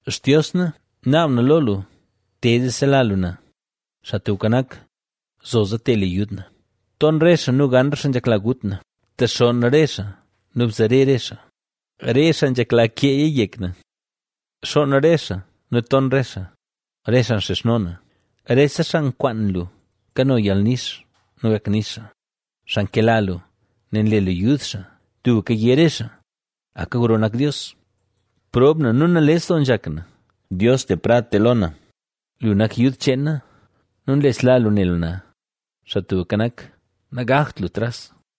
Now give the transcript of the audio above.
Xtios na, naab na lo lu: “¡Te, zee sela lu na!” Xaa Tubka Nak, ¡zoza, te le yud na! Ton re xaa nu gan re xaa nzhekla gut na, btexonn re xaa nu bzare re xaa; re xaa nzhekla keeya yek na. Xoon re xaa nu ton re xaa, re xaa nxizhno na. Rese xaa nkwaan lu kano yalnix nu gak nix xaa, xaa nkela lu, nel nle lu yud xaa tubka yé re xaa: “¡Aka gro nak Dios!” Prob na nu nales doo nzhak na, Dios le prad te lo na; lu nak yud cheen na nu nlesla lu ne lu na. ¡Xaa Tubka Nak, nagakt lu tras!